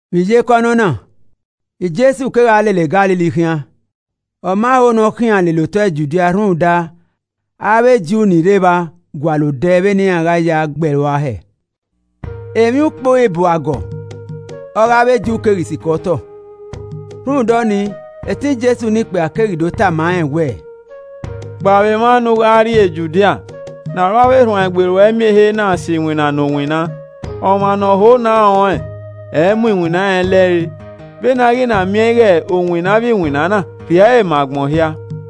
Vbe iyeke ọnọna, Jesu kegha lele Galili khian, ọ ma ho ne ọ khian lele otọ Judia rhunmwuda avbe Ju ni rre evba gualọ odẹ vbene iran gha ya gbe ẹe rua hẹẹ. Emwiukpo Ibu agọ ọghe avbe Ju keghi sikẹ otọ. Rhunmwuda ọnii etẹn Jesu ne ikpia keghi do tama rẹn wẹẹ, “Kpao vbe emwa ne u gha rrie Judia ne aro avbe erhuanegbe ruẹ miẹn ehe na sẹ iwinna ne u winna. Ọmwa ne ọ ho ne a rẹn ọnrẹn, ẹ i mu iwinna rẹn lẹrre. Vbene a ghi na miẹn ighe u winna avbe iwinna na, rhie ẹre ma agbọn hia!”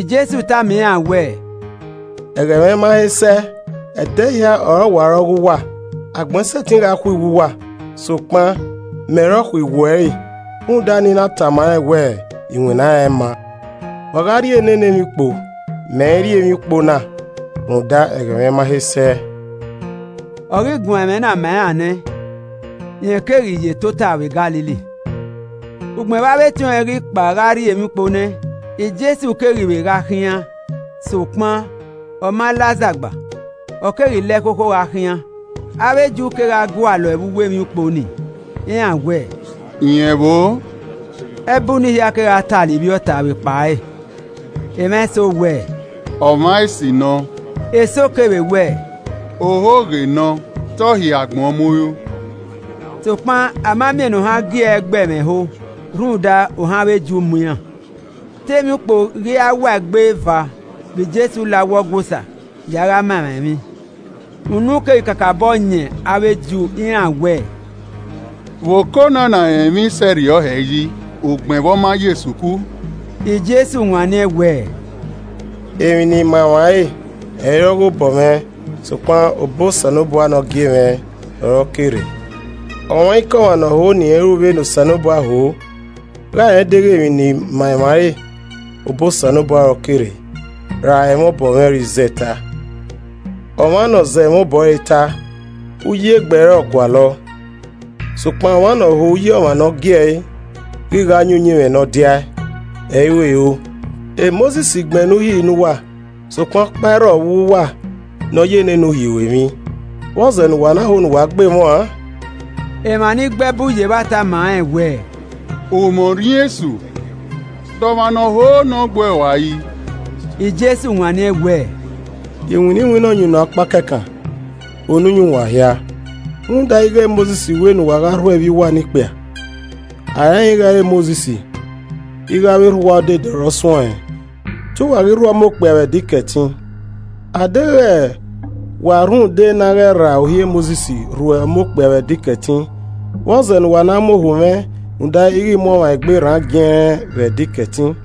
Jesu tama iran wẹẹ, “Ẹghẹ mwẹ ma he sẹ. Ẹdẹ hia ọre ọ wa re ọ ghe uwa. Agbọn i sẹtin gha khuiwu uwa, sokpan mẹ ọre ọ khuiwu ẹre rhunmwuda ne I na tama rẹn wẹ iwinna rẹn ẹ i ma. Wa gha rrie nene emwiukpo, mẹ i rrie emwiukpo na rhunmwuda ẹghẹ mwẹ ma he sẹ.” Ọ ghi guan ẹmwẹ na ma iran nẹ, rẹn keghi ye tota vbe Galili. Ugbẹn vbe avbe etiọnrẹn ghi kpao gha rrie emwiukpo nẹ, Jesu keghi vbe gha khian sokpan ọ ma la azagba, ọ keghi la ẹkhokho gha khian. Avbe Ju kegha gualọ ẹe vbe uwu emwiukpo ni, iran wẹẹ, “Rẹn vbo o?” Ẹbu ni hia kegha talọ ivbi ọta vbe ekpa ẹre. Emwa eso wẹ, “Ọmwa esi nọ,” eso kevbe wẹẹ, “Ohoghe nọ, te ọ hiẹ agbọn mu ru.” Sokpan a ma miẹn ne ohan gi ẹe gbe ẹmwẹ ẹho rhunmwuda ohan avbe Ju mu iran. Te emwiukpo ghi ra wa egbe eva vbe Jesu la uwu Ọgua Osa ya gha ma emwa emwi. Unu keghi kakabọ yan avbe Ju, iran wẹẹ, “Vbe okona na rẹn emwi sẹ rriọ hẹ yi ugbẹn vbe ọ ma yo esuku?” Jesu wanniẹn wẹẹ, “Emwi ne I ma emwa re ẹ i re ọghe obọ mwẹ sokpan obọ Osanobua ne ọ gie mwẹ ọre ọ ke rre. Ọmwaikọmwa ne ọ ho ne irẹn ru vbene Osanobua ho gha rẹn deghẹ emwi ne I ma emwa ẹre obọ Osanobua ọre ọ ke rre ra ẹmwẹ obọ mwẹ ọre I zẹ ta. Ọmwa ne ọ zẹ ẹmwẹ obọ ẹre ta, uyi egbe ẹre ọ gualọ. Sokpan ọmwa ne ọ ho uyi ọmwa ne ọ gie ẹe ghi gha yin uyinmwẹ ne ọ diae, ẹ i ru ero. Mosis gbẹnnẹ Uhi ne uwa, sokpan ọkpa i rrọọ vbe uwu uwa ne ọ ye nene Uhi ru emwi. Vbọzẹ ne uwa na ho ne uwa gbe mwẹ uan?” Emwa ni gbe ẹbu ye evba tama rẹn wẹẹ, “U mwẹ Orhiọn esu, de ọmwa ne ọ ho ne ọ gbe uẹ ua yi?” Jesu wanniẹn wẹẹ, “Iwinna iwinna ọyunnuan ọkpa kẹkan, unu yan uwa hia. Rhunmwuda ighe Mosis wẹ ne uwa gha rhuẹ ivbi uwa ne ikpia (a rẹnrẹn ighe ẹ i re Mosis, ighe avbe erha uwa odede ọre ọ suẹn ọnrẹn), te uwa ghi rhuẹ ọmọ okpia vbe Ẹdẹ Ikẹtin. Adeghẹ wa rhunmwuda na ghẹ rra Uhi Mosis, rhuẹ ọmọ okpia vbe Ẹdẹ Ikẹtin, vbọzẹ ne uwa na mu ohu mwẹ rhunmwuda ighe I mu ọmwa egbe rran giẹnrẹn vbe Ẹdẹ Ikẹtin?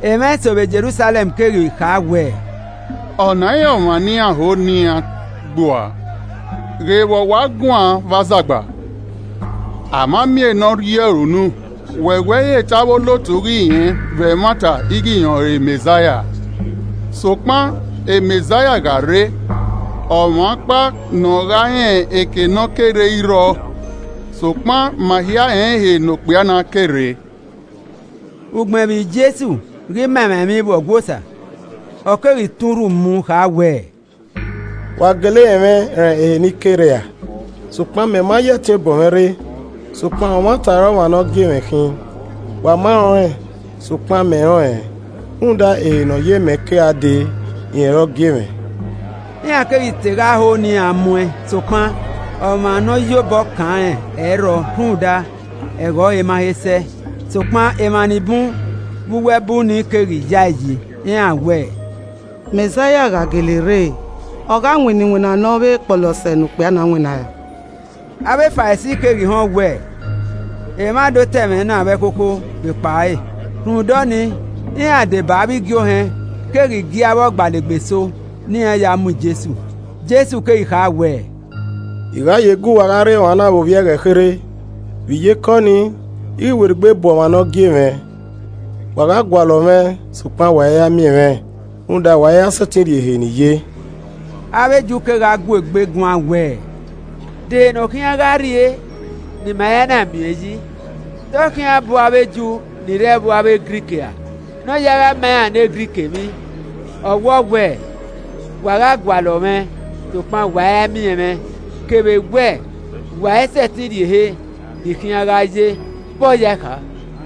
Emwa eso vbe Jerusalẹm keghi kha wẹẹ, “Ọna i re ọmwa ne iran ho ne iran gbe ua? Ghe vbe ọ wa guan vbe azagba, a ma miẹn ne ọ rri ọre unu! Wẹ wẹ i re te avbe olotu ghi rẹn vbe ẹmwata ighe rẹn ọrọre Mẹzaia? Sokpan, Mẹzaia gha re ọmwa ọkpa ne ọ gha rẹn ehe ne ọ ke rre ẹ i rriọ. Sokpan ma hia rẹn ehe ne okpia na ke rre.” Ugbẹn vbe Jesu ghi ma emwa emwi vbe Ọgua Osa, ọ keghi tọn urhu mu kha wẹẹ, “Wa gele rẹn mwẹ, rẹn ehe ne I ke re ra? Sokpan mẹ ma ya ẹtin obọ mwẹ rre. Sokpan ọmwata ọre ọmwa ne ọ gie mwẹ khin. wa ma rẹn ọnrẹn. Sokpan mẹ rẹn ọnrẹn, rhunmwuda ehe ne ọ ye mẹ ke gha dee, rẹn ọre ọ gie mwẹ.” Iran keghi te gha ho ne iran mu ẹn sokpan, ọmwa ne ọ ye obọ kan rẹn ẹ i rrọọ rhunmwuda ẹghẹ ọre ma he sẹ. Sokpan emwa ni bun vbe uwu ẹbu nii keghi ya ẹe yi, iran wẹẹ, “Mẹzaia gha gele re, ọ gha winna iwinna ne ọ vbe kpọlọ sẹ ne okpia na winnaẹn ra?” Avbe Farisi keghi họn wẹ emwa do ta ẹmwẹ na vbe ẹkhokho vbe ekpa ẹre, rhunmwuda ọnii, iran, deba avbe igie ohẹn keghi gie avbe ọgbalegbe eso ne iran ya mu Jesu. Jesu keghi kha wẹẹ, “I gha ye gu uwa gha rre emwa vbe ovbi ẹghẹ kherhe, vbe iyeke ọnii, I ghi werriegbe bu ọmwa ne ọ gie mwẹ. Wa gha gualọ mwẹ sokpan wa i ra miẹn mwẹ, rhunmwuda wa i ra sẹtin rrie ehe ne I ye.” Avbe Ju kegha gu egbe guan wẹẹ, “De ehe ne ọ khian gha rrie ne ima i ra na miẹn ọẹn yi? Te ọ khian bu avbe Ju ni rre ẹvbo avbe Grik ra ne ọ ya gha ma iran ne Grik emwi? Ọ wọ wẹ, ‘Wa gha gualọ mwẹ sokpan wa i ra miẹn mwẹ,’ kevbe wẹẹ, ‘Wa i sẹtin rrie ehe ne I khian gha ye,’ vbọ yae kha?”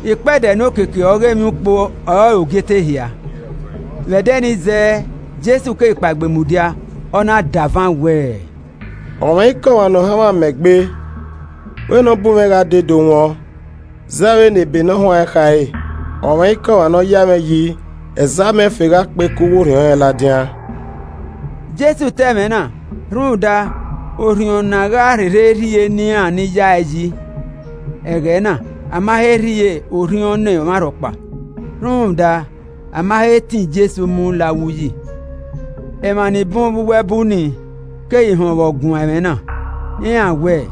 Ikpẹdẹ ne okiekie ọghe emwiukpo ọrọre ogiete ehia. Vbe ẹdẹ ni zẹẹ, Jesu keghi kpaegbe mudia, ọ na davan wẹẹ, “Ọmwaikọmwa ne ohanmwẹ amẹ gbe, wẹ ne ọ bu mwẹ gha dee ne ọ do wọn. ( Zẹ vbene ebe ne ọ huanrẹn khare, ‘Ọmwaikọmwa ne ọ ya mwẹ yi, ẹzẹ amẹ ẹfe gha kpe ke uwu orhiọn rẹn ladian.’” Jesu ta ẹmwẹ na rhunmwuda Orhiọn ne a gha rherhe rhie ne iran ni ya ẹe yi. Ẹghẹ na, a ma he rhie Orhiọn ne ọmwarhọkpa rhunmwuda a ma he tọn Jesu mu la uwu uyi.) Emwa ni bun vbe uwu ẹbu nii keghi họn vbe ọ guan ẹmwẹ na, iran wẹẹ,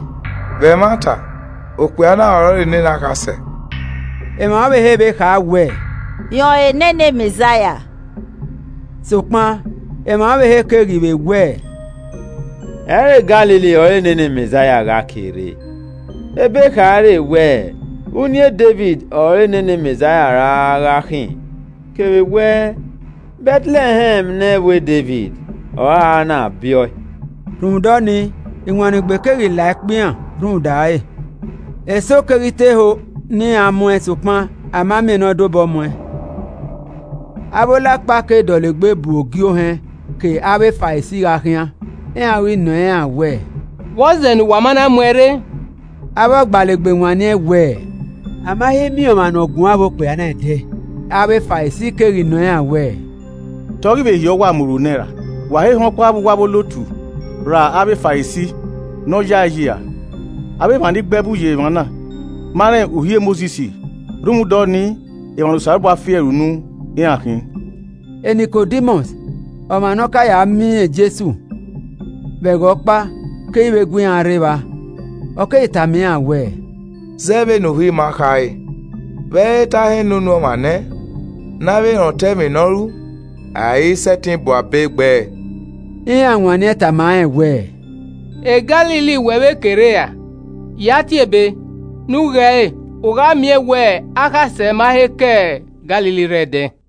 “Vbe ẹmwata, okpia na ọrọre nene Akhasẹ!” Emwa ọvbehe vbe kha wẹẹ, “Rọẹn ọrọre nene Mẹzaia!” Sokpan emwa ọvbehe keghi vbe wẹẹ, “Ẹ i re Galili ọre nene Mẹzaia gha kere! Ebe khare wẹ uniẹn Devid ọre nene Mẹzaia ra gha khin, kevbe wẹ Bẹtlẹhẹm ne ẹvbo Devid ọre a ra na biẹ ọe.” Rhunmwuda ọnii, Iwannegbe keghi la ẹkpo iran rhunmwuda ẹre. Eso keghi te ho ne iran mu ẹn, sokpan a ma miẹn ne ọ dobọ muẹn. Avbe Olakpa ke dọlegbe bu ogiohẹn ke avbe Farisi gha khian. Iran ghi nọ iran wẹ, “Vbọzẹ ne uwa ma na mu ẹẹn rre?” Avbe ọgbalegbe wanniẹn wẹẹ, “A ma he miẹn ọmwa ne ọ guan vbe okpia na ẹdẹ!” Avbe Farisi keghi nọ iran wẹẹ, “Te ọ ghi vbe hiẹ uwa mu ru nẹ ra? Wa he họn ọkpa vbe uwu avbe olotu ra avbe Farisi ne ọ ya ẹe yi ra? Avbe emwa ni gbe ẹbu ye evba na ma rẹn Uhi Mosis rhunmwuda ọnii emwa ne Osanobua fi ẹre unu iran khin!” Nikodimọs, ọmwa ne ọ ka ya miẹn Jesu vbe ẹghẹ ọkpa keghi vbe gu iran rre evba, ọ keghi tama iran wẹẹ, “Zẹ vbene Uhi ima khare, vbe ẹ i re te a họn ne unu ọmwa nẹ ne avbe rẹn otọ emwi ne ọ ru a i sẹtin bu abe gbe ẹe.” Iran wanniẹn tama rẹn wẹẹ, “E Galili wẹ vbe ke rre ra? Ya tie Ebe ne u ghe ẹre, u gha miẹn wẹ akhasẹ ma he ke Galili rre ẹdẹ.”